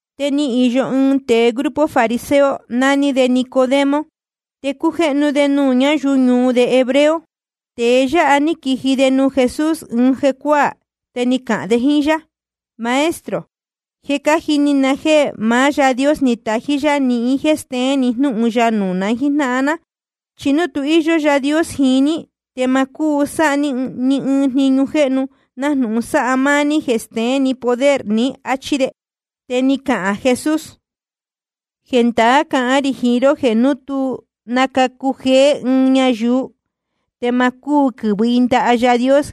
Te ni īyo ɨɨn tēe grupo fariseo, naní de Nicodemo, te cújéhnu de nuū ñáyuu ñuu de hebreo. Tēe yáha ní quiji de nuū Jesús ɨɨn jecuáā, te ni cahān de jíín yá: Maestro, je cájini na jéē maá Yaā Dios ni tají yá nihín jéē steén ni jnúhun ya nuū na jíjnáhan ná. Chi núu tu íyó Yaā Dios jiín ní, te ma cúu sáha ní ni ɨɨn jniñu jéhnu nájnūhun sáha máá ní jeē steén ni poder ní, áchí de. Te ni cahān Jesús: Jendaá cahán rī jiín ró jeē núu tu nacacu jeé ɨɨn ñayuu, te ma cúu quɨ̄vɨ i ndaha Yaā Dios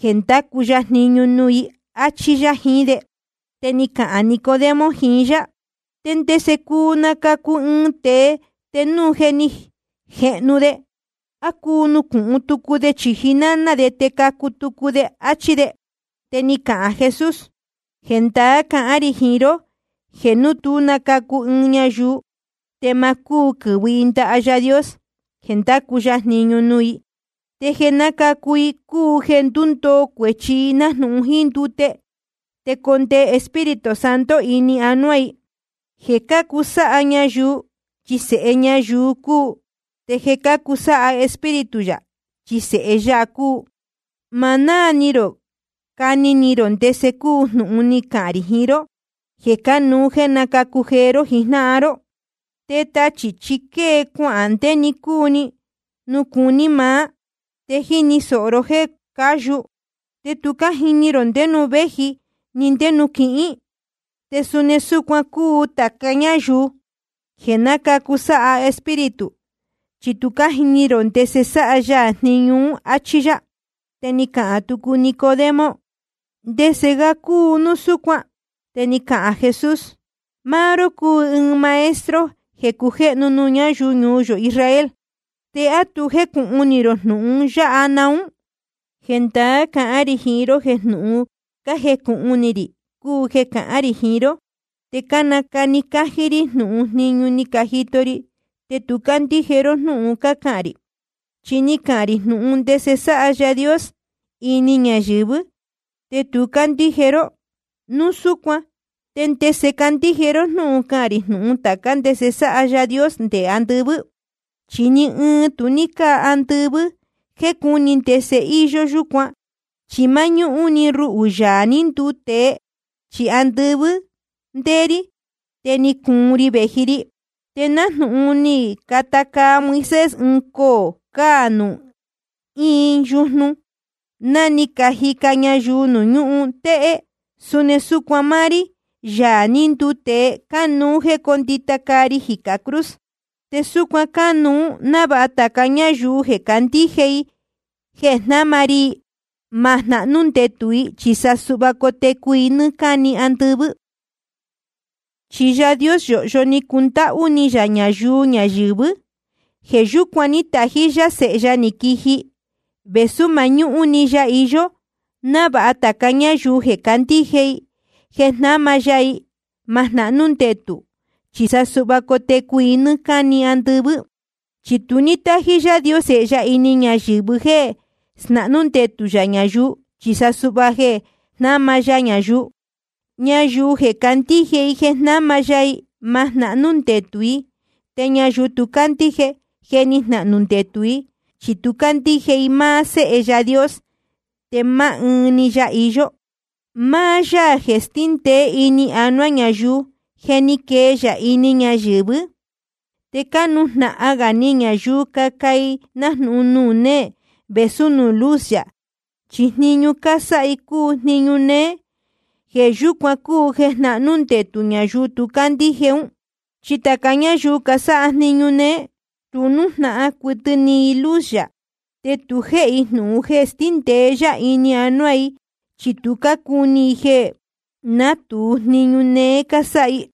jeē ndacu ya jniñu nuū i, áchí yá jiín de. Te ni cahān Nicodemo jiín yá: ¿Te ndese cuu nacacu ɨɨn tēe te núu je ni jehnu de? ¿A cuu nucūhun tucu de chīji náná de te nacacu tucu de? áchí de. Te ni cahān Jesús: Jendaá cahán rī jiín ró jeē núu tú nacacu ɨɨn ñayuu, te ma cúu quɨ̄vɨ i ndaha Yaā Dios jeē ndacu ya jniñu nuū i. Te jeē nácacu i cúu jeē ndúndoo cuēchi i nájnūhun jíín ndute, te condee Espíritu Santo ini anuá i. Jeē cácu sáha ñayuu, chi sēhe ñayuu cúu. Te jeē cácu sáha Espíritu yā, chi sēhe ya cúu. Ma náā ni rō cani ni rō ndese cúu jnūhun ni cahān rī jiín ró jeē cánuú jéē nacacu jeé ró jijnáhan ró. Te tachī chi quée cuahān ndé‑ni cúu nuū cuní maá, te jíni sōho ró jéē cáyu, te tu jíní rō ndé nuū véji ni ndé nuū quihín. Te suni súcuan cúu tāca ñáyuu jeē nácacu sáha Espíritu, chi tu jíní rō ndese sáha ya jniñu ún, áchí yá. Te ni cahān tucu Nicodemo: ¿Ndese ga cúu núu súcuan? Te ni cahān Jesús: Máá ró cúu ɨɨn maestro jeē cujéhnu nuū ñáyuu ñuu yō Israel, te ¿á tu jécūhun ni rō jnūhun yáha naún? Jendaá cahán rī jiín ró jeē jnūhun cájecūhun ni rī cúu jeē cácahān rī jiín ró. Te cánacani cájí rí jnūhun jniñu ní cajito ri. Te tu cácandíje ró jnúhun cácahān rī. Chi ni cahān rī jnūhun ndese sáha Yaā Dios ini ñayɨ̄vɨ́, te tu cácandíje ró. Núu súcuan ¿te ndese candíje ró núu cahān rī jnūhun tācá ndese sáha ya nde andɨvɨ́? ’Chi ni ɨɨn tu ní cáa andɨvɨ́ jeē cúni ndese íyó yúcuan, chi máñúhún‑ni ruhū, Yaā ní nduu tēe. Chi andɨvɨ́ ndéé rí, te ni cuun ri vēji ri. Te nájnūhun ni cata caa Moisés ɨɨn coō cāa nuū ɨɨn yujnu, ná ni cajica ñayuu nuū ñúhun téhé, suni súcuan máá rí, Yaā ní nduu tēe, cánuú jéē cóndita caa ri jicā cruz. Te súcuan cánuú návāha tāca ñáyuu jeē candíje i jeē jnáma ri i, ma jnahnú ndetū i, chi sa suhva cotecu i nɨ́ɨ́ cáni andɨvɨ́. ’Chi Yaā Dios yōhyo ni cundáhú ni yā ñayuu ñayɨ̄vɨ́. Jeē yúcuan ní tají yá Sēhe ya ni quiji, vēsú mañúhún‑ni ya iyó, návāha tāca ñáyuu jeē candíje i jeē jnáma ya i, ma jnahnú ndetū, chi sa suhva cotecu i nɨ́ɨ́ cáni andɨvɨ́. Chi tu ní tájí Yaā Dios Sēhe ya ini ñayɨ̄vɨ jéē snahnú ndetū yā ñayuu, chi sa suhva jeē jnáma ya ñayuu. ’Ñayuu jeē candíje i jeē jnáma ya i, ma jnahnú ndetū i. Te ñayuu tu cándíje, je ni jnahnū ndetū i, chi tu ní cándíje i máá Séhe Yaā Dios, te máá ɨɨn‑ni ya iyó. Máá Yaā jeē stíndēé ini anuá ñayuu, je ni quee ya ini ñayɨ̄vɨ́. Te cánujnahan gā ni ñayuu caca i nájnūhun nuū néē vēsú nuū luz yā, chi jniñu cásáha i cúu jniñu néé. Jeē yúcuan cúu jeē jnahnú ndetū ñayuu tu cácandíje ún. Chi tāca ñáyuu casáha jniñu néé, tu nújnahan cuɨtɨ ni i luz yā. Te tu jéhe i jnūhun jeē stíndēe yá ini anuá i, chi tu cúní i jeē natūu jniñu néé cásáha i.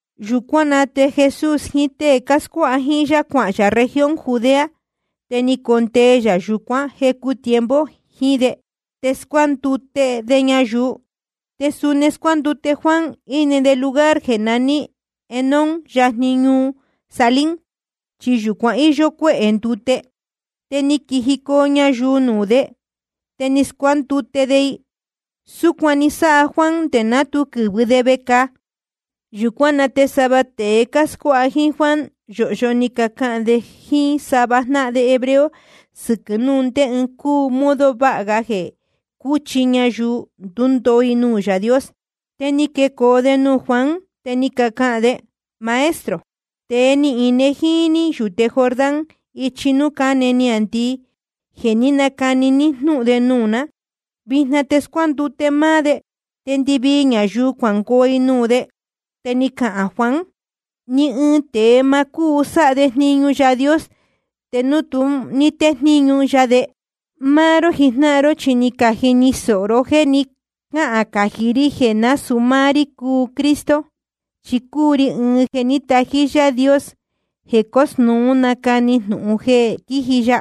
Yūcuán na te Jesús jiín tée cáscuáha jíín yá, cuahān yā región Judea. Te ni condee yā yūcuán jecu tiempo jiín de, te cáscuándute de ñayuu. Te suni scuándute Juan, íne de lugar jeē naní Enón yajni ñuu Salim, chi yūcuan íyó cuéhē ndute. Te ni quijicoo ñayuu nuū de, te ni scuándute de i. Súcuan ni sáha Juan nde ná tu quɨ̄vɨ de vecāa. Yūcuán na te sava tēe cáscuáha jíín Juan yōhyo ni cacahān de jíín sava jnáhan de hebreo sɨquɨ̄ núu ndé ɨɨn cúu modo vāha ga jeē cúchi ñayuu ndundoo i nuū Yaā Dios. Te ni quecoo de nuū Juan, te ni cacahān de: Maestro, tēe ní ine jíín ní yūte Jordán ichi núū cáne niāndii, jeē ní nacani ní jnúhun de nuū ná, vijna te scuándute máá de, te ndɨvii ñayuu cuangoo i nuū de. Te ni cahān Juan: Ni ɨɨn tēe ma cúu sáha de jniñu Yaā Dios te núu ma tejníñu ya de. Máá ró jijnáhan ró chi ni cajini sōho ró jéē ni cáhān cají rí jeē násūu máá rí cúu Cristo, chi cúu ri ɨɨn jeē ní tají Yaā Dios jeē cósnūú nacani jnūhun jeē quíji ya.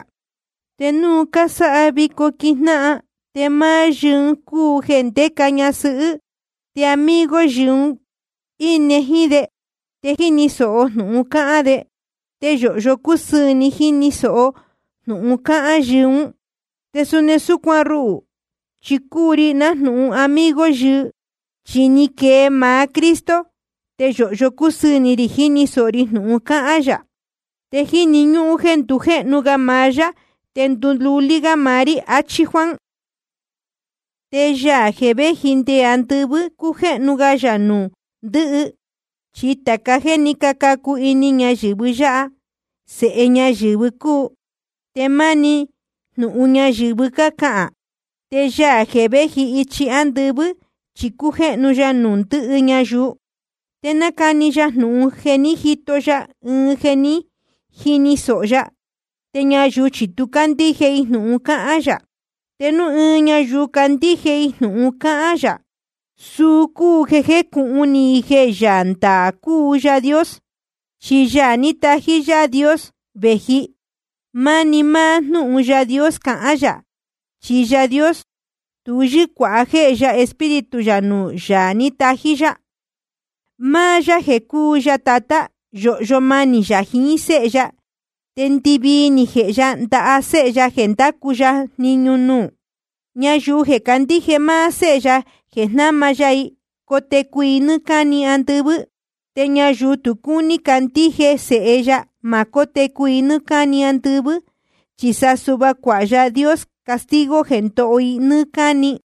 Te núu cásáha vico quíjnáhan, te máá yɨɨ cúu jeē ndéca ñasɨhɨ́. Te amigo yɨɨ un íne jíín de, te jíni sōho jnūhun cáhán de. Te yōhyo cúsɨɨ̄ ni jíni sōho jnūhun cáhán yɨɨ ún. Te suni súcuan ruhū, chi cúu ri nájnūhun amigo yɨɨ, chi ni quee maá Cristo, te yōhyo cúsɨɨ̄ ni rī jíni sōho ri jnūhun cáhán yā. Te jíni ñúhún jéē ndujéhnu ga maá yá te ndululí gá maá rí, achí Juan. Te Yaā jeē véji nde andɨvɨ́, cújéhnu ya nuū ndɨhɨ. Chi tāca jéē ní cacu ini ñayɨ̄vɨ yáha, sēhe ñayɨ̄vɨ cúu, te máni jnūhun ñayɨ̄vɨ cáhán. Te Yaā jeē véji ichi ándɨvɨ́, chi cújéhnu ya nuū ndɨhɨ ñayuu. Te nácani ya jnūhun jeē ní jito ya jiín jéē ní jini sōho ya. Te ñayuu chi tu cácandíje i jnūhun cáhán yā. Te núu ɨɨn ñayuu candíje i jnūhun cáhán yā, suu cúu jeē jejnúhún i jeē Yaā ndaā cúu Yaā Dios. Chi Yaā ní tají Yaā Dios vēji, máni máá jnúhun Yaā Dios cahán yā. Chi Yaā Dios tu yɨ́cuāha jéhe ya Espíritu yā nuū Yaā ní tají yá. Máá yá jeē cúu ya Tatá, yōhyo manī yā jiín Séhe ya, te ndɨvii ni jēhe ya ndaha Séhe ya jeē ndacu ya jniñu nuū. Ñayuu jeē candíje máá Séhe ya jeē jnáma ya i, cotecu i nɨ́ɨ́ cáni andɨvɨ́. Te ñayuu tu cúní candíje Sēhe ya, ma cótecu i nɨ́ɨ́ cáni andɨvɨ́, chi sa suhva cuāha Yaā Dios castigo jeē ndoho i nɨ́ɨ́ cáni.